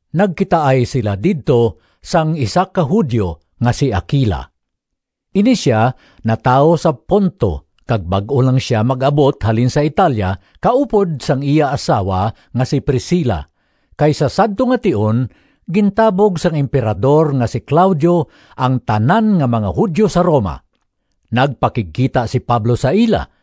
Nagkitaay sila didto sang isa ka Judio nga si Aquila. Ini sia natawo sa Ponto kag bag-o lang sia mag-abot halin sa Italia kaupod sang iya asawa nga si Priscila, kay sa sadto nga tion gintabog sang Emperador nga si Claudio ang tanan nga mga Judio sa Roma. Nagpakigkita si Pablo sa ila,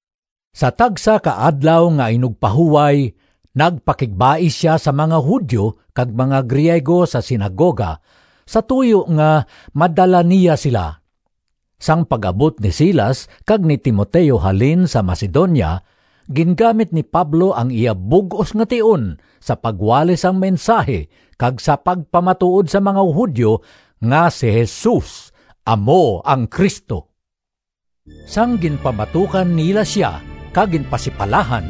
Sa tagsa ka Adlaw nga Inugpahuway nagpakigbais sia sa mga Judio kag mga Griego sa sinagoga sa tuyo nga madala niya sila. Sang pag-abot ni Silas kag ni Timoteo halin sa Macedonia, gingamit ni Pablo ang iya bug-os nga tion sa pagwali sang mensahi kag sa pagpamatuod sa mga Judio nga si Jesus amo ang Cristo. Sang ginpamatukan nila sia kag ginpasipalahan,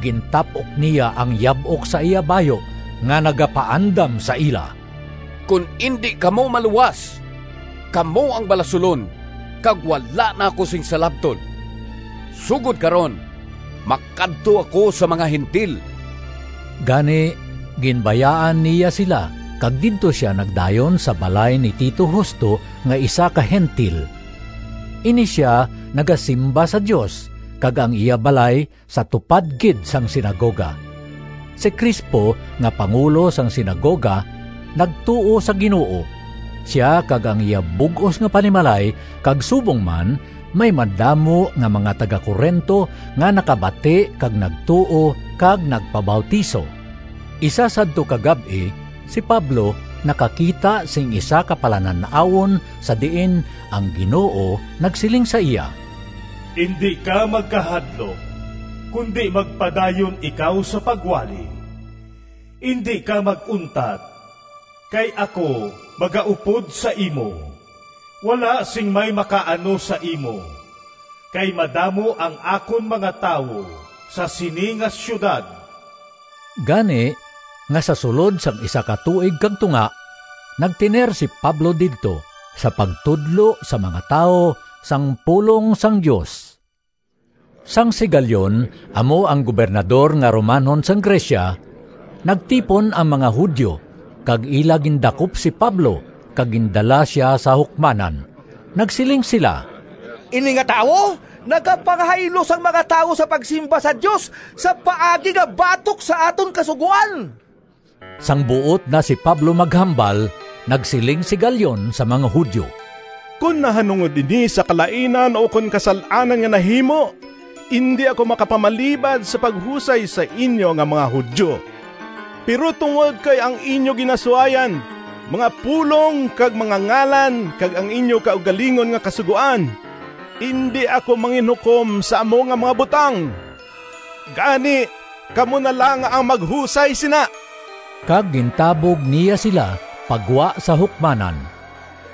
gintap-ok niya ang yab-ok sa iya bayu nga nagapaandam sa ila, “Kon indi kamo maluwas, kamo ang balasulon kag wala na ako sing salabton. Sugod karon makadto ako sa mga Gentil.” Gani ginbayaan niya sila kag didto sia nagdayon sa balay ni Tito Justo nga isa ka Gentil. Ini sia nagasimba sa Dios, kag ang iya balay sa tupad gid sang sinagoga. Si Crispo nga pangulo sang sinagoga nagtuo sa Ginoo, sia kag ang iya bug-os nga panimalay kag subong man may madamo nga mga taga-Corinto nga nakabati kag nagtuo kag nagpabautiso. Isa sadto ka gab-i si Pablo nakakita sing isa ka palanan-awon sa diin ang Ginoo nagsiling sa iya, “Indi ka magkahadlok, kundi magpadayon ikaw sa pagwali. Indi ka mag-untat, kay ako magaupod sa imo. Wala sing may makaano sa imo, kay madamo ang akon mga tawo sa sini nga siyudad.” Gani nga sa sulod sang isa ka tuig kag tunga, nagtener si Pablo didto sa pagtudlo sa mga tawo sang pulong sang Dios. Sang si Galion amo ang gobernador nga Romanhon sang Grecia, nagtipon ang mga Judio kag ila gindakop si Pablo kag gindala sia sa hukmanan. Nagsiling sila, “Ini nga tawo nagapanghaylo sang mga tawo sa pagsimba sa Dios sa paagi nga batok sa aton kasugoan!” Sang buot na si Pablo maghambal, nagsiling si Galion sa mga Judio, “Kon nahanungod ini sa kalainan ukon kasal-anan nga nahimo, indi ako makapamalibad sa paghusay sa inyo nga mga Judio. Pero tungod kay ang inyo ginasuayan mga pulong kag mga ngalan kag ang inyo kaugalingon nga kasugoan, indi ako manginhukom sa amo nga mga butang. Gani kamo na lang ang maghusay sina!” Kag gintabog niya sila pa gwa sa hukmanan.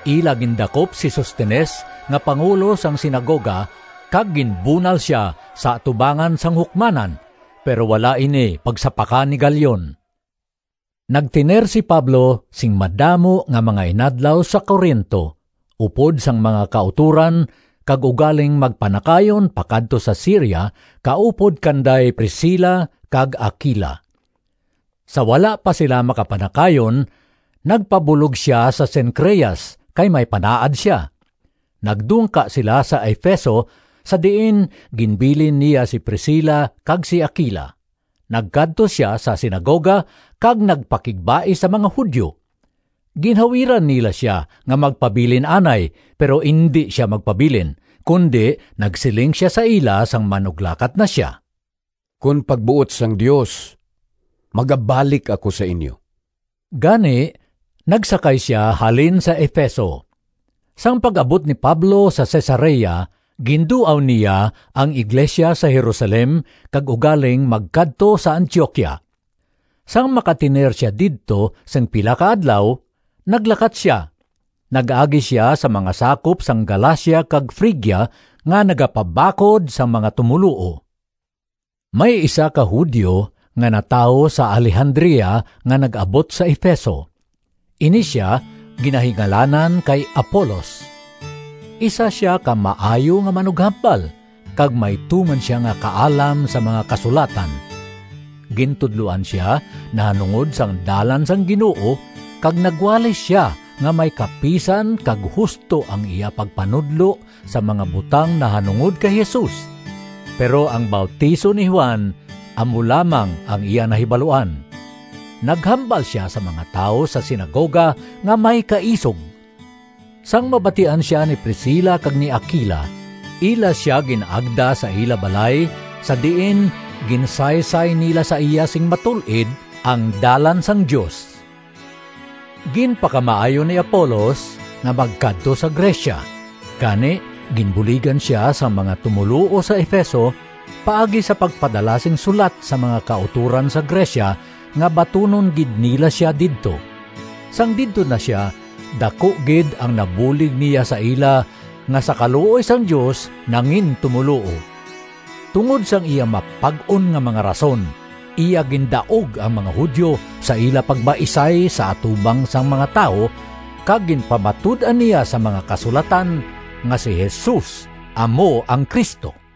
Ila gindakop si Sostenes nga pangulo sang sinagoga kag ginbunal sia sa atubangan sang hukmanan, pero wala ini pagsapaka ni Galion. Nagtener si Pablo sing madamo nga mga inadlaw sa Corinto upod sang mga kautoran kag ugaling magpanakayon pakadto sa Siria kaupod kanday Priscila kag Aquila. Sa wala pa sila makapanakayon nagpabulog sia sa Cencreas kay may panaad sia. Nagdungka sila sa Efeso sa diin ginbilin niya si Priscila kag si Aquila. Nagkadto sia sa sinagoga kag nagpakigbais sa mga Judio. Ginhawiran nila sia nga magpabilin anay, pero indi sia magpabilin, kundi nagsiling sia sa ila sang manuglakat na sia, “Kon pagbuot sang Dios magabalik ako sa inyo.” Gani nagsakay sia halin sa Efeso. Sang pag-abot ni Pablo sa Cesarea, ginduaw niya ang iglesia sa Jerusalem kag ugaling magkadto sa Antioquia. Sang makatener sia didto sing pila ka adlaw, naglakat sia. Nag-agi sia sa mga sakop sang Galacia kag Frigia nga nagapabakod sang mga tumoluo. May isa ka Judio nga natawo sa Alejandria nga nag-abot sa Efeso. Ini sia ginahingalanan kay Apolos. Isa sia ka maayo nga manughambal kag may tuman sia nga kaalam sa mga Kasulatan. Gintudloan sia nahanungod sang Dalan sang Ginoo kag nagwali sia nga may kapisan kag husto ang iya pagpanudlo sang mga butang nahanungod kay Jesus, pero ang bautiso ni Juan amo lamang ang iya nahibaluan. Naghambal sia sa mga tawo sa sinagoga nga may kaisog. Sang mabatian sia ni Priscila kag ni Aquila, ila sia gin-agda sa ila balay sa diin ginsaysay nila sa iya sing matul-id ang Dalan sang Dios. Ginpakamaayo ni Apolos nga magkadto sa Grecia, gani ginbuligan sia sang mga tumoluo sa Efeso paagi sa pagpadala sing sulat sa mga kautoran sa Grecia, nga batunon gid nila sia didto. Sang didto na sia daku gid ang nabulig niya sa ila nga sa kaluoy sang Dios nangintumoluo. Tungod sang iya mapag-on nga mga rason, iya gindaog ang mga Judio sa ila pagbaisay sa atubang sang mga tawo kag ginpamatud-an niya sa mga Kasulatan nga si Jesus amo ang Cristo.